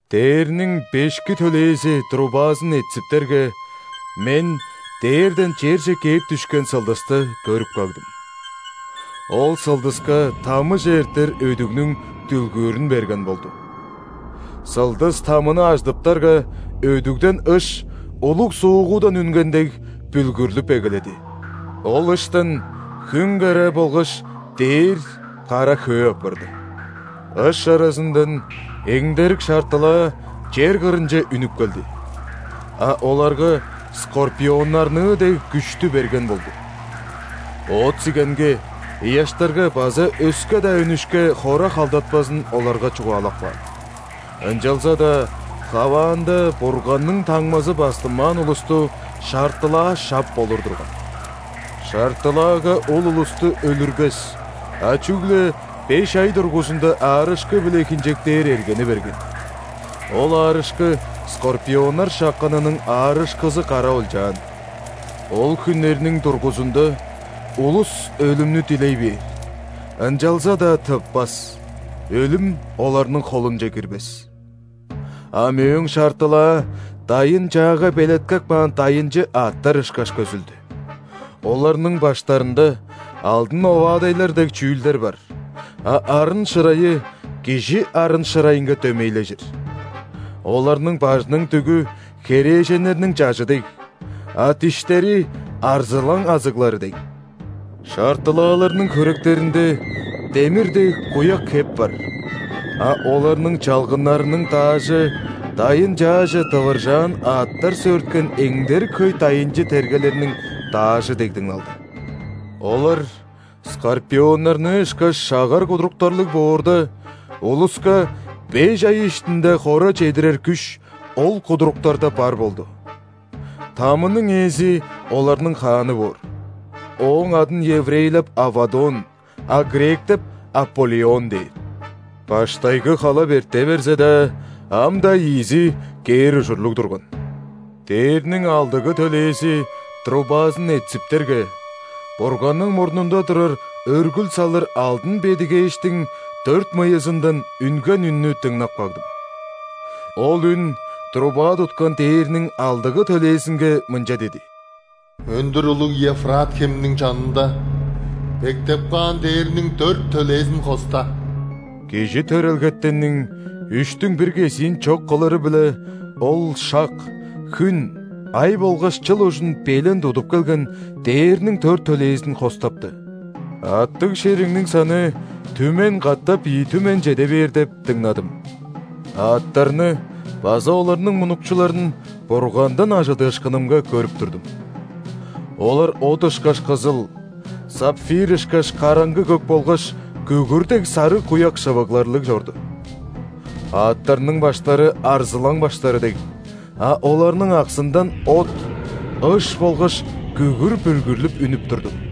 Дээрниң бешки төлээзи трубазын этсиптерге, мен дээрден черже кээп дүшкен сылдысты көрүп кагдым. Ол сылдыска ·тамыже эртер өдүгнүң дүлгүүрүн берген болду. Сылдыс тамыны ажыдыптарга, өдүгден ыш, улуг суугудан үнген дег, бүлгүрлүп эгеледи. Ол ыштан хүн караа болгаш дээр кара хөө апарды. Ыш аразындан эңдерик шартылаа чер кырынче үнүп келди, а оларга скорпионнарныы дег күштү берген болду. Оът-сигенге, ыяштарга база өске-даа үнүшке хора халдатпазын оларга чугаалап каан. Ынчалза-даа хаваанда Бурганның таңмазы бастынмаан улусту шартылаа шап болур турган. Шартылаага ол улусту өлүрбес, а чүгле беш ай дургузунда аарышкы-биле хинчектээр эргени берген. Ол аарышкы скорпионнар шакканының аарышкызы кара олчаан. Ол хүннерниң дургузунда улус өлүмнү дилей бээр, ынчалза-даа тыппас, өлүм оларның холунче кирбес. А мөөң шартылаа дайын-чаага белеткеп каан дайынчы аъттар ышкаш көзүлдү. Оларның баштарында алдын оваадайлар дег чүүлдер бар, а арын-шырайы кижи арын-шырайынга дөмейлежир. Оларның бажының дүгү херээженнерниң чажы дег, а диштери арзылаң азыглары дег. Шартылааларның хөректеринде демир дег куяк хеп бар, а оларның чалгыннарының даажы дайын-чааже дывыржаан аъттар сөөрткен эңдерик хөй ·дайынчы тергелерниң даажы дег дыңналды. Олар скорпионнарныы ышкаш шагар кудуруктарлыг боорда, улуска беш ай иштинде хора чедирер күш ол кудуруктарда бар болду. Тамының ээзи оларның хааны боор, ооң адын еврейлеп Аввадон, а гректеп Аполлион дээр. Баштайгы халап эрте берзе-даа, ам-даа ийизи кээр ужурлуг турган. Дээрниң алдыгы төлээзи трубазын этсиптерге, Бурганның мурнунда турар өргүл салыр алдын бедигээштиң дөрт мыйызындан үнген үннү дыңнап кагдым. Ол үн труба туткан дээрниң алдыгы төлээзинге мынча диди: «Өндүр улуг Евфрат хемниң чанында бектеп каан дээрниң дөрт төлээзин хоста». Кижи төрелгетенниң үштүң бир кезиин чок кылыры-биле, ол шак, хүн, ай болгаш чыл ужун белен тудуп келген дээрниң дөрт төлээзин хостапты. Аъттыг шеригниң саны түмен катап ийи түмен чеде бээр деп дыңнадым. Аъттарны база оларның мунукчуларын Бургандан ·ажыдыышкынымга көрүп турдум. Олар от ышкаш кызыл, сапфир ышкаш караңгы көк болгаш күгүр дег сарыг куяк шывыгларлыг чорду. Аъттарның баштары арзылаң баштары дег, а оларның аксындан от, ыш болгаш күгүр бүлгүрлүп үнүп турду.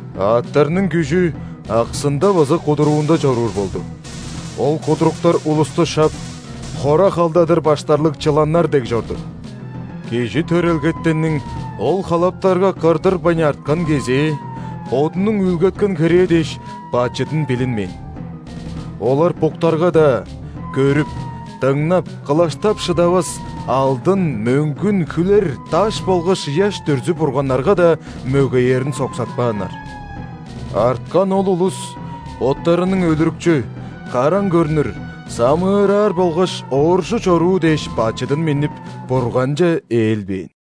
Аъттарның күжү аксында база кудуруунда чоруур болду. Ол кудуруктар улусту шап, хора халдадыр баштарлыг чыланнар дег чорду. Кижи төрелгетенниң ол халаптарга кырдырбайн арткан кезээ бодунуң үүлгеткен херээ дээш, бачыдын билинмээн. Олар буктарга-даа, көрүп, дыңнап, кылаштап шыдавас алдын, мөңгүн, хүлер, даш болгаш ыяш дүрзү-бурганнарга-даа мөгеерин соксатпааннар. Арткан ол улус боттарының өлүрүкчү, караң көрнүр, самыыраар болгаш ооржу чоруу дээш бачыдын миннип, Бурганче ээлбээн.